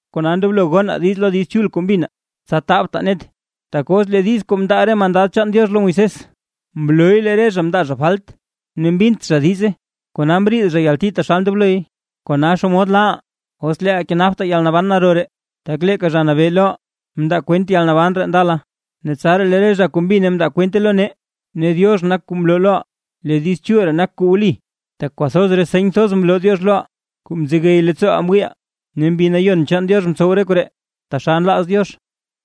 Kona ndoblo gonaa diiz lo Diiz Chul kuu mbinaa, tsa tabtaa net. Tak os lee diiz kuu mndaa re mandad chaan Diox lo Moisés, mlooy lee re zha mndaa zha falt ne mbint zha diize, kona mriid zha yalti taxal ndobloy. ¿Kona xomod laaʼaa, os leeʼaa kenaptaa yalnaban naro ree? Tak leeka Zha Nabee loʼaa mndaa kwent yalnaban ree ndala, ne tsaraa lee re zha kuu mbine mndaa kwente lo nee. Ne Diox nak kuu mloo loʼaa lee Diiz Chul ree nak kuu wli, tak kwathoz re seny thoz mloo Diox loʼaa, kuu mzegey leettsooʼaa mwiiʼaa, ne Mbi Nayon chaan Diox mtsow re koree taxal nlaaz Diox.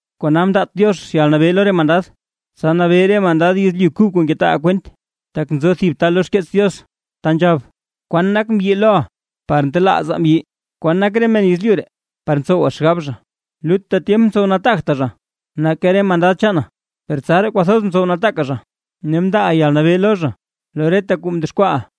Kona mndaat Diox yalnabee lo re mandad, tsa nabee re mandad yezlyu kub kuu ngetaaʼaa kwent. Tak nzo thib ta lo xkeets Diox ta nzhab: ¿Kwan nak mbyi loʼa par ntelaaza mbyi? ¿Kwan nak re men yezlyu ree, par ntsowa xgab zha? Lutta tyemp mtsow nataagta zha nake re mandad chaana, per tsaraa kwathoz mtsow nataaka zha, ne mndaaʼa yalnabee lo zha, lo reta kuu mdexkwaaʼa.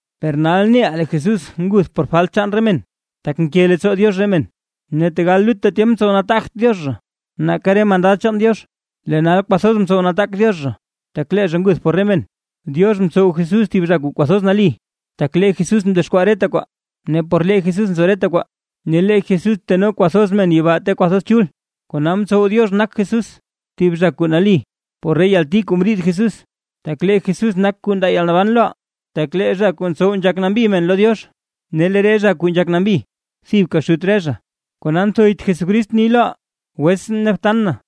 Per lee nal neʼaa lee Jesús nguth por falt chaan re men, tak nke leettsoo Diox re men. Ne tegal lutta tyemp mtsow nataagt Diox zha nake re mandad chaan Diox, lee nal kwathoz mtsow nataak Diox zha, tak lee zha nguth por re men. Diox mtsow Jesús thib zha kuu kwathoz nali, tak lee Jesús mdexkwaa reta kwaa ne por lee Jesús nzo reta kwaa, ne lee Jesús teno kwathoz men yibaa ta kwathoz chul, kona mtsow Diox nak Jesús thib zha kuu nali por re yalti kuu mriid Jesús, tak lee Jesús nak kuu ndaa yalnaban loʼaa. Tak lee zha kuu ntsow nzhak nambi men lo Diox, ne lee re zha kuu nzhak nambi, thibka Xut re zha. Kona nthoyt Jesucrist ni loʼaa: “wetsʼn ne btan na”,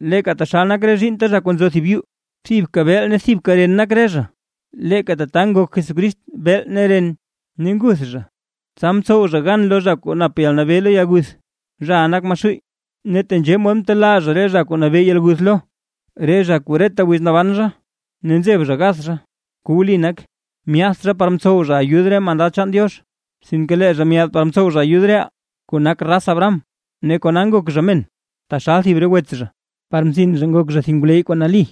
Leeka taxal nak re zhiinnta zha kuu nzo thib yuu, thibka beel ne thibka ren nak re zha; leeka tata ngok Jesucrist beel ne ren, ne nguth zha tsa mtsow zha gan lo zha kuu nap yalnabee lo yalguth, zhaʼa nak Maxuuy. Ne tenzhee mod mtelaa zha re zha kuu nabee yalguth lo, re zha kuu reta wiz kuu naban zha ne nzeb zha gath zha. Kuu wli nak: Myaadt zha par mtsow zha ayud re mandad chaan Diox, sinke lee zha myaad par mtsow zha ayud reʼaa, kuu nak raz Abraham. Ne kona ngok zha men, taxal thib re wets zha, par mzin zha nak zha thib ngwleyy kuu nali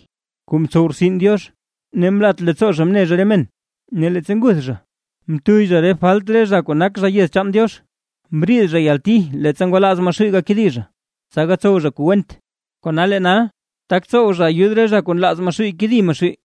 kuu mtsow rtsin Diox, ne mlat leettsoo zha mne zha re men, ne leettsa nguth zha, mtuyy zha re falt chaan re zha kuu nak zha yez chaan Diox. Mbriid zha yalti leettsa ngwalaaz Maxuuy gakedi zha, tsa gatsow zha kuu went, kona lee nal, tak tsow zha ayud re zha kuu nlaaz Maxuuy kedi Maxuuy.